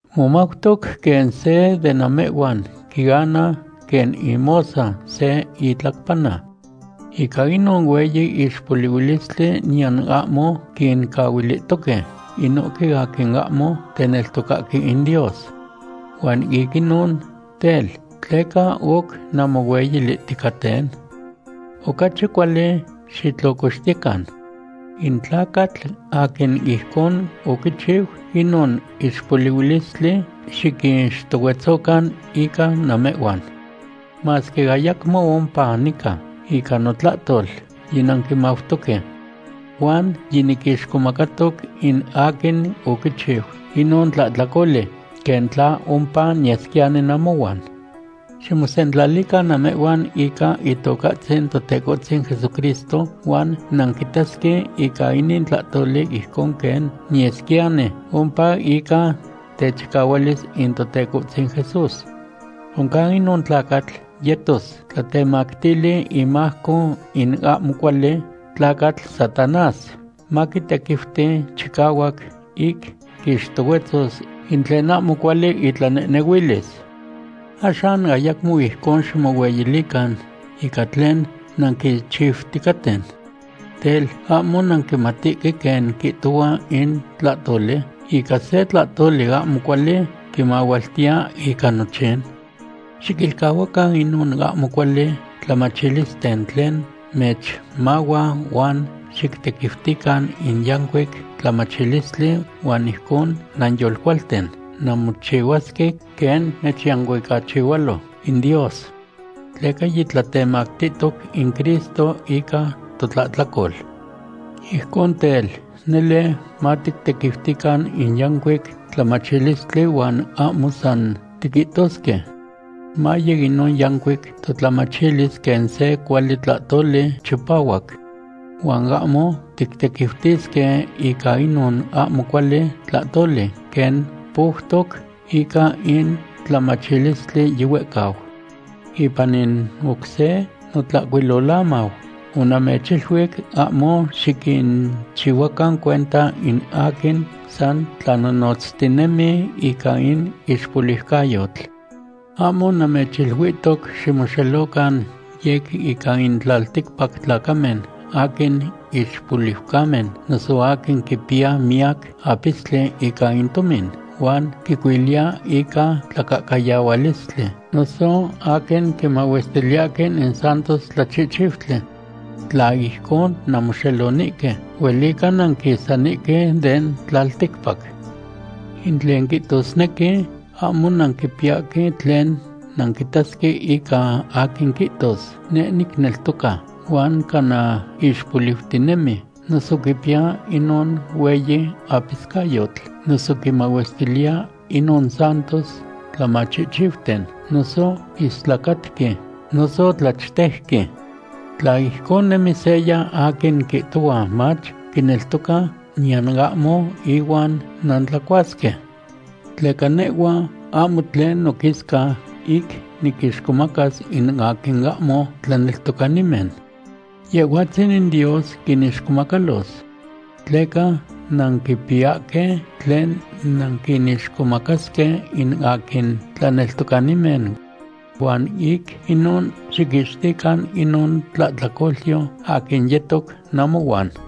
Momautoc quen se de namehhuan quiana quen imosa se itlacpanana. Ica inon hueyi ixpolihuilistli niyan ahmo quincahuilihtoque inohque aquin ahmo teneltocahque in Dios. Huan ic inon tel, ¿tleca oc nanmohueyilihticaten? Ocachi cuali xitlocoxtiyecan. In tlacatl aquin ijcon oquichiu inon ixpolihuilistli xiquixtohuetzocan ica namehhuan. Masque ayacmo ompa nica, ica notlahtol yinanquimautoque. Huan yiniquixcomacatoc in aquin oquichiu inon tlahtlacoli, quen tla ompa niyesquiyani namohuan. Ximosentlalican namehhuan ica Itocahtzin Totecohtzin Jesucristo huan nanquitasque ica inin tlahtoli ijcon quen niyesquiyani ompa ica techicahualis in Totecohtzin Jesús. Oncan inon tlacatl yetos tlatemactili imajco in ahmo cuali tlacatl Satanás, maquitequiuti chicahuac ic quixtohuetzos in tlen ahmo cuali itlanehnehuilis. Axan ayacmo ijcon ximohueyilican ica tlen nanquichiuticaten. Tel, ¿ahmo nanquimatihque quen quihtohua in tlahtoli: “Ica se tlahtoli ahmo cuali quimahualtiya ica nochin”? Xiquilcahuacan inon ahmo cuali tlamachilisten tlen mechmahua huan xictequiutican in yancuic tlamachilistli huan ijcon nanyolcualten nanmochihuasque quen mechyancuicachihualo in Dios. Tleca yitlatemactihtoc in Cristo ica totlahtlacol. Ijcon tel, nele matictequiutican in yancuic tlamachilistli huan ahmo san tiquihtosque. Maye inon yancuic totlamachilis quen se cuali tlahtoli chipahuac. Huan ahmo tictequiutisque ica inon ahmo cuali tlahtoli quen poutoc ica in tlamachilistli yihuehcau. Ipan in oc se notlahcuilolamau onamechiluic ahmo xiquinchihuacan cuenta in aquin san tlanonotztinemi ica in ixpoliucayotl. Ahmo namechiluihtoc ximoxelocan yec ica in tlalticpac tlacamen aquin ixpoliucamen noso aquin quipiya miyac apistli ica in tomin huan quicuiliya ica tlacahcayahualistli, noso aquin quimahuestiliyahque in santos tlachihchiutli. Tla ijcon nanmoxelonihque, huelica nanquisanihque den tlalticpac. In tlen niquihtosnequi, ahmo nanquipiyahque tlen nanquitasque ica aquin quihtos: “Neh nicneltoca”, huan cana ixpoliutinemi noso quipiya inon hueyi apiscayotl, noso quimahuestiliya inon santos tlamachihchiuten, noso istlacatqui, noso tlachtejqui. Tla ijcon nemi seya aquin quihtohua mach, quineltoca, niyan ahmo ihuan nantlacuasque. Tleca nehhua ahmo tlen noquisca ic niquinixcomacas in aquin ahmo tlaneltocanimen. Yehhuatzin in Dios quinixcomacalos. Tleca nanquipiyahque tlen nanquinixcomacasque in aquin tlaneltocanimen. Huan ic inon xiquixtican inon tlahtlacolyo aquin yetoc namohuan.